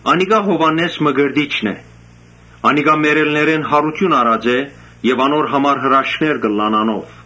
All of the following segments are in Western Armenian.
«Անիկա Յովհաննէս Մկրտիչն է, մեռելներէն յարութիւն առած եւ անոր համար հրաշքներ կ’ըլլան անով»։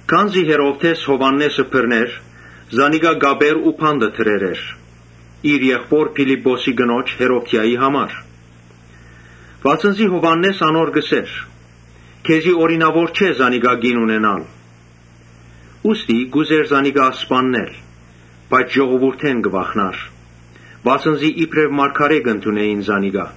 Քանզի Հերովդէս Յովհաննէսը բռներ, զանիկա կապեր ու բանտը դրեր էր, իր եղբօր Փիլիպպոսին կնոջ՝ Հերովդիային համար։ Վասն զի Յովհաննէս անոր կ’ըսէր. «Քեզի օրինաւոր չէ զանիկա կին առնելը»։ Ուստի կ’ուզէր զանիկա սպաննել, բայց ժողովուրդէն կը վախնար, վասն զի իբրեւ մարգարէ կ’ընդունէին զանիկա։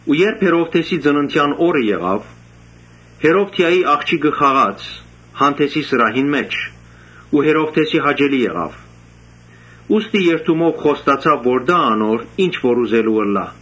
Երբ Հերովդէսին ծննդեան օրը եկաւ, Հերովդիային աղջիկը խաղաց հանդէսի սրահին մէջ ու Հերովդէսին հաճելի եղաւ։ Ուստի երդումով խոստացաւ որ տայ անոր ի՛նչ որ ուզելու ըլլայ։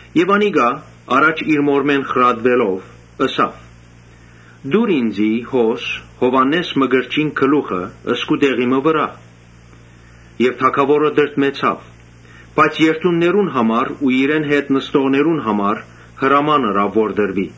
Անիկա առաջ իր մօրմէն խրատուելով՝ ըսաւ. «Տուր ինծի Յովհաննէս Մկրտչին գլուխը՝ սկուտեղի մը վրայ»։ Թագաւորը տրտմեցաւ, բայց երդումներուն ու իրեն հետ նստողներուն համար հրաման ըրաւ որ տրուի։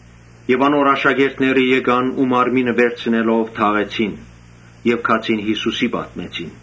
Անոր աշակերտները եկան ու մարմինը վերցնելով թաղեցին, գացին Յիսուսին պատմեցին։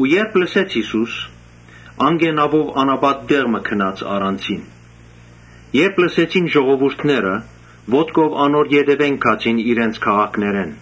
Երբ Յիսուս լսեց, անկէ նաւով անապատ մը գնաց առանձին։ Երբ ժողովուրդը լսեց, ոտքով անոր ետեւէն գացին իրենց քաղաքներէն։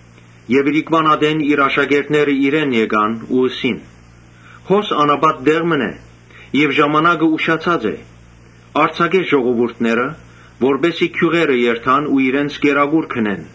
Իրիկունը իր աշակերտները եկան ու ըսին. «Հոս անապատ տեղ մըն է եւ ժամանակը ուշացած է. արձակէ ժողովուրդը, որպէս զի գիւղերը երթան ու իրենց կերակուր գնեն»։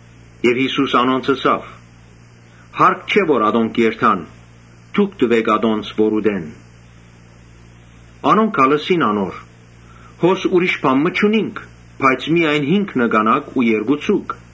Յիսուս անոնց ըսաւ. «Հարկ չէ որ ատոնք երթան, դուք տուէք անոնց որ ուտեն»։ Անոնք ալ ըսին. «Հոս ուրիշ բան մը չունինք, բայց միայն հինգ նկանակ ու երկու ձուկ»։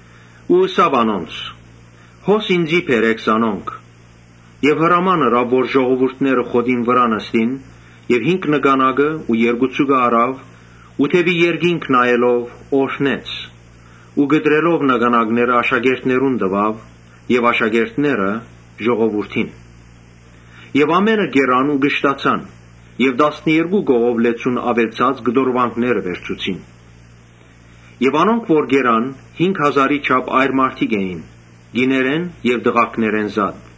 Ըսաւ անոնց. «Հոս, ինծի բերէք զանոնք»։ Եւ հրաման ըրաւ որ ժողովուրդը խոտին վրայ նստեցնեն։ Հինգ նկանակը եւ երկու ձուկը առաւ, դէպի երկինք նայելով օրհնեց ու կտրելով նկանակները աշակերտներուն տուաւ եւ աշակերտները՝ ժողովուրդին։ Ամէնքը կերան ու կշտացան եւ տասներկու կողով լեցուն աւելցած կտորուանքներ վերցուցին։ Անոնք որ կերան, հինգ հազարի չափ այր մարդիկ էին, կիներէն եւ տղաքներէն զատ։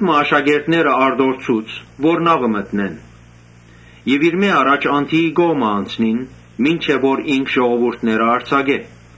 Աշակերտները արտորցուց, որ նաւը մտնեն եւ իրմէ առաջ անդիի կողմը անցնին, մինչեւ որ ինք ժողովուրդը արձակէ։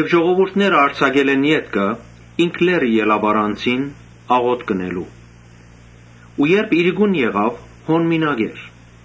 Ժողովուրդը արձակելէն ետքը, ինք լեռը ելաւ առանձին աղօթք ընելու։ Երբ իրիկուն եղաւ, հոն մինակ էր,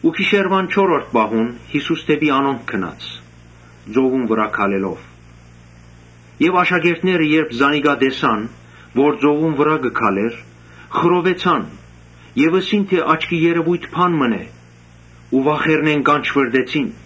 Գիշերուան չորրորդ պահուն Յիսուս դէպի նաւը գնաց, ծովուն վրայէն քալելով։ Երբ աշակերտները մէկը տեսան, որ ծովուն վրայ կը քալէր, խռովեցան եւ ըսին թէ՝ աչքի երեւոյթ մըն է։ Վախնալով կանչուըռտեցին։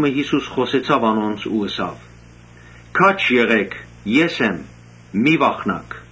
Յիսուս խօսեցաւ անոնց ու ըսաւ. «Քաջ եղէք, ե՛ս եմ, մի՛ վախնաք»։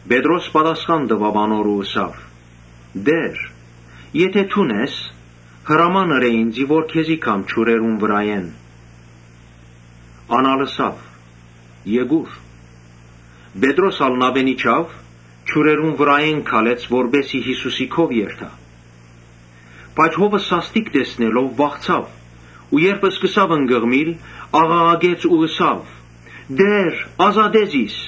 Պետրոս պատասխան տուաւ անոր ու ըսաւ. «Տէ՛ր, եթէ դուն ես, հրաման ըրէ ինծի որ քեզի գամ ջուրերուն վրայէն»։ Ան ալ ըսաւ. «Եկո՛ւր»։ Պետրոս ալ նաւէն իջաւ, ջուրերուն վրայէն քալեց որպէս զի Յիսուսի քով երթայ։ Բայց հովը սաստիկ ըլլալուն՝ վախցաւ։ Երբ սկսաւ ընկղմիլ, աղաղակեց ու ըսաւ. «Տէ՛ր, ազատէ զիս»։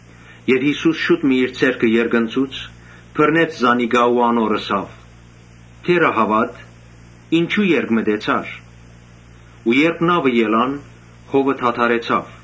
Յիսուս շուտ մը իր ձեռքը երկնցուց, բռնեց զանիկա ու ըսաւ. «Թերա՛հաւատ, ինչո՞ւ երկմտեցար»։ Երբ նաւը ելան, հովը դադարեցաւ։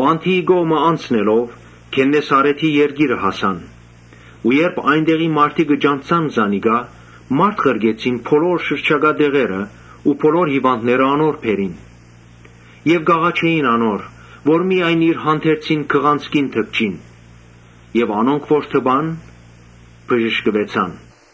Անդիի կողմը անցնելով, Գեննեսարէթ հասան։ Երբ այն տեղի մարդիկ ճանչցան զանիկա, մարդ ղրկեցին բոլոր շրջակայ տեղերը ու բոլոր հիւանդները անոր բերին. Եւ կ’աղաչէին անոր, որ միայն իր հանդերձին քղանցքին դպչին։ Անոնք որ դպան, բժշկուեցան։